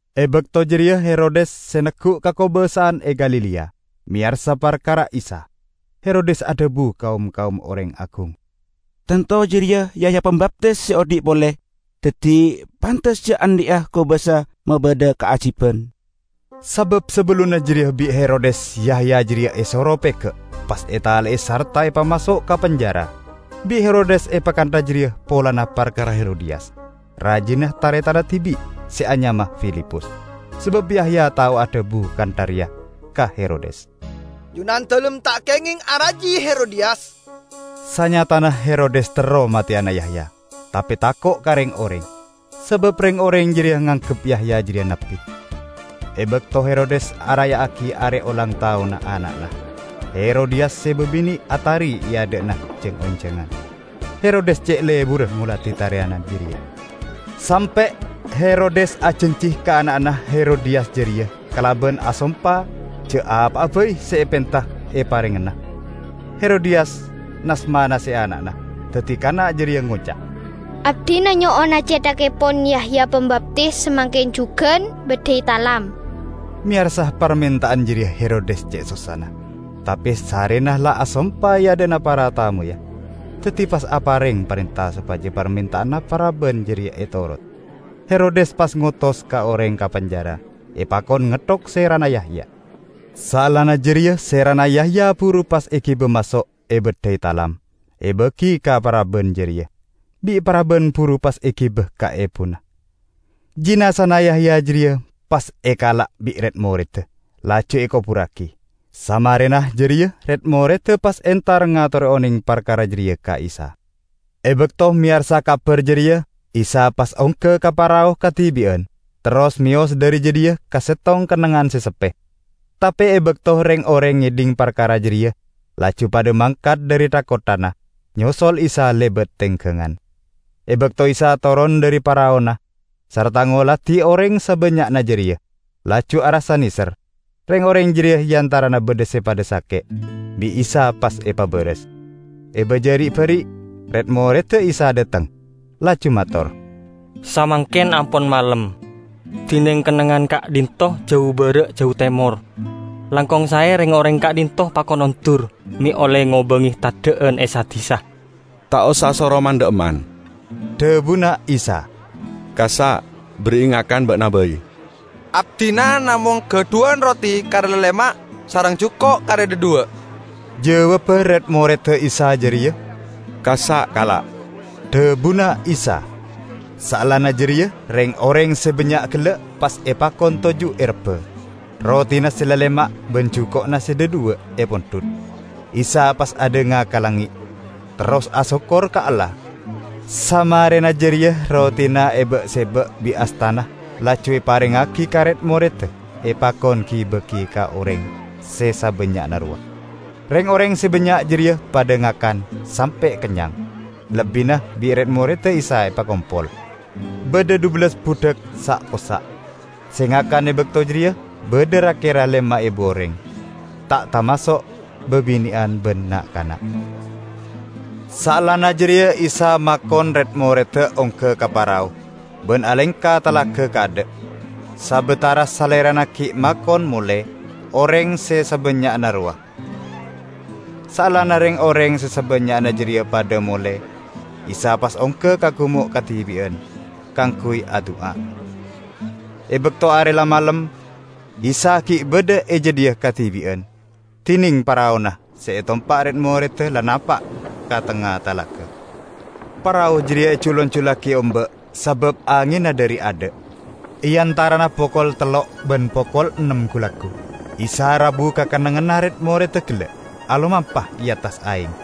E bakto jareya Herodes, se neggu' kakobasa'an e Galilea, meyarsa parkara Isa. Herodes adhabu ka om-kaom oreng agung, "Tanto jareya Yahya Pambaptis se odhi' pole! Daddi pantes ja' andhi'a kobasa mabadha kaajiban." Sabab sabellunna jareya bi' Herodes Yahya jareya esoro pega' pas etale'e sarta pas epamaso' ka penjara. Bi' Herodes epakantha jareya polana parkara Herodiyas, rajina taretanna dibi' se anyama Filipus. Sabab Yahya tao adhabu kantha reya ka Herodes, "Junandalem ta' kengeng araji Herodiyas!" Sanyatana Herodes terro mateyana Yahya, tape tako' ka reng-oreng, sabab reng-oreng jareya nganggep Yahya jareya nabbi. E bakto Herodes araya'agi are olang taonna, ana'na Herodiyas se babine' atari e adha'na jang-onjangan. Herodes ce' leburra ngoladi tariyanna jareya, sampe' Herodes ajanji ka ana'na Herodiyas jareya kalaban asompa ja' apa'a bai se epenta eparengngana. Herodiyas nas-manase ana'na, daddi kana' jareya ngoca', "Abdina nyo'ona cethakkepon Yahya Pambaptis samangken jugan, baddhai talam!" Meyarsa parmenta'an jareya Herodes ce' sossana. Tape sarrena la asompa e adha'na para tamoyya, daddi pas apareng parenta sopaja parmenta'anna paraban jareya etorodi. Herodes pas ngotos oreng ka penjara epakon ngetthok serana Yahya. Saellana jareya serana Yahya buru pas egiba maso' ebaddhai talam, ebagi ka paraban jareya. Bi' paraban buru pas egiba ka ebuna. Jinazana Yahya jareya pas ekala' bi' red-moredda, laju ekoburragi. Samarena jareya red-moredda pas entar ngatore oneng parkara jareya ka Isa. E bakto meyarsa kabar jareya, Isa pas ongga ka parao kadibi'an terros meyos dhari jadhiya ka settong kennengngan se seppe. Tape e bakto reng-oreng ngedhing parkara jareya, laju padha mangkat dhari tha-kotthana, nyosol Isa lebat tenggangan. E bakto Isa toron dhari paraona sarta ngoladi oreng sabannya'na jareya, laju arassa neser. Reng-oreng jareya e antarana badha se padha sake' bi' Isa pas epabaras. E baja ri'-bari', red-moredda Isa dhateng laju mator, "Samangken ampon malem, dineng kennengngan ka'dhinto' jau bara' jau temor. Langkong sae reng-oreng ka'dhinto' pakon ondur, me' olle ngobange teddha'an e sa-disa." "Ta' osa soro man-dha'emman," dhabuna Isa. "Kassa' berri'i ngakan ba'na bai." "Abdina namong gadhuwan roti kare lalema' sareng juko' kare dhadhuwa'!" jawabba red-moredda Isa jareya. "Kassa' kala'," dhabuna Isa. Saellana jareya reng-oreng se bannya' gella' pas epakon toju' e rebba. Rotina se lalema' ban juko'na se dhadhuwa' epondhut; Isa pas adhanga ka langnge' terros asokkor ka Allah. Samarena jareya rotina eba'-seba' bi' astana laju eparengngagi ka red-moredda epakon gi-bagi ka oreng se sabannya'na rowa. Reng-oreng se bannya' jareya padha ngakan sampe' kennyang. Lebbina bi' red-moredda Isa epakompol, badha dhubellas budhak sa'-possa'. Se ngakan e bakto jareya badha ra-kera lema ebu oreng, ta' tamaso' babine'an ban na'-kana'. Saellana jareya Isa makon red-moredda ongga ka parao ban alengka talaga kaadha', sabatara Salerana gi' makon mole oreng se sabannya'na rowa. Saellana reng-oreng se sabannya'na jareya padha mole, Isa pas ongga ka gumo' kadibi'an kaangguy adu'a. E bakto are la malem, Isa gi' badha e jadhiya kadibi'an. Dineng paraona se etompa' red-moredda la napa' ka tengnga talaga. Parao jareya ejul-anjullagi omba', sabab angenna dhari adha'. E antarana pokol tello' ban pokol ennem gu-laggu, Isa rabu ka kennengnganna red-moredda gella' alomampa e attas aeng.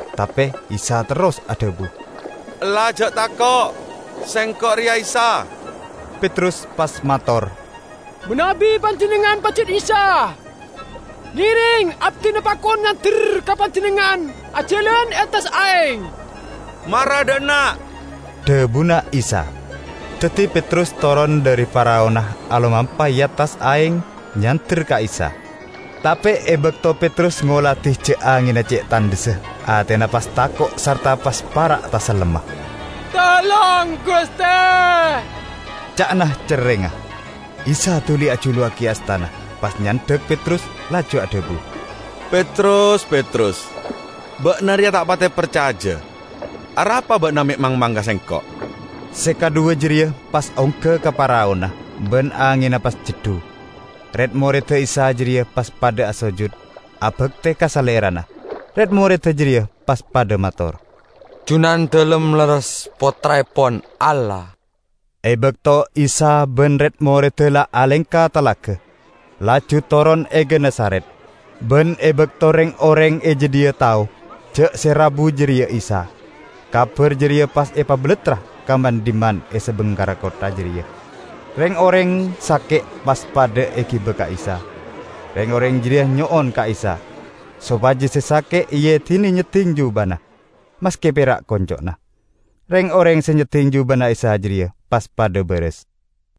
Tape Isa terros adhabu, "Ella ja' tako'! Sengko' reya Isa!" Petrus pas mator, "Manabi Panjennengngan pajat Isa, ngereng abdina pakon nyander ka Panjennengngan ajalan e attas aeng." "Mara dha' enna'," dhabuna Isa. Daddi Petrus toron dhari paraona, alomampa e attas aeng nyander ka Isa. Tape e bakto Petrus ngoladi ja' angenna ce' tandhessa, atena pas tako' sarta pas para' tasellemma. "Tolong, Guste!" ca'na cerrengnga. Isa duli ajuluwagi astana pas nyandhak Petrus laju adhabu, "Petrus, Petrus, ba'na reya ta' pate parcaja. Arapa ba'na me' mangmang ka Sengko'?" Se kadhuwa jareya pas ongga ka paraona, ban angenna pas ceddu. Red-moredda Isa jareya pas padha asojud abakte ka Salerana. Red-moredda jareya pas padha mator, "Junandalem lerres Pottraepon Allah!" E bakto Isa ban red-moredda la alengka talaga laju toron e Genesaret. Ban e bakto reng-oreng e jadhiya tao ja' se rabu jareya Isa, kabar jareya pas epabalattra ka man-dhimman e sabingkerra kottha jareya. Reng-oreng sake' pas padha egiba ka Isa. Reng-oreng jareya nyo'on ka Isa sopaja se sake' eedine nyedding jubana, maske pera' konco'na. Reng-oreng se nyedding jubana Isa jareya pas padha baras.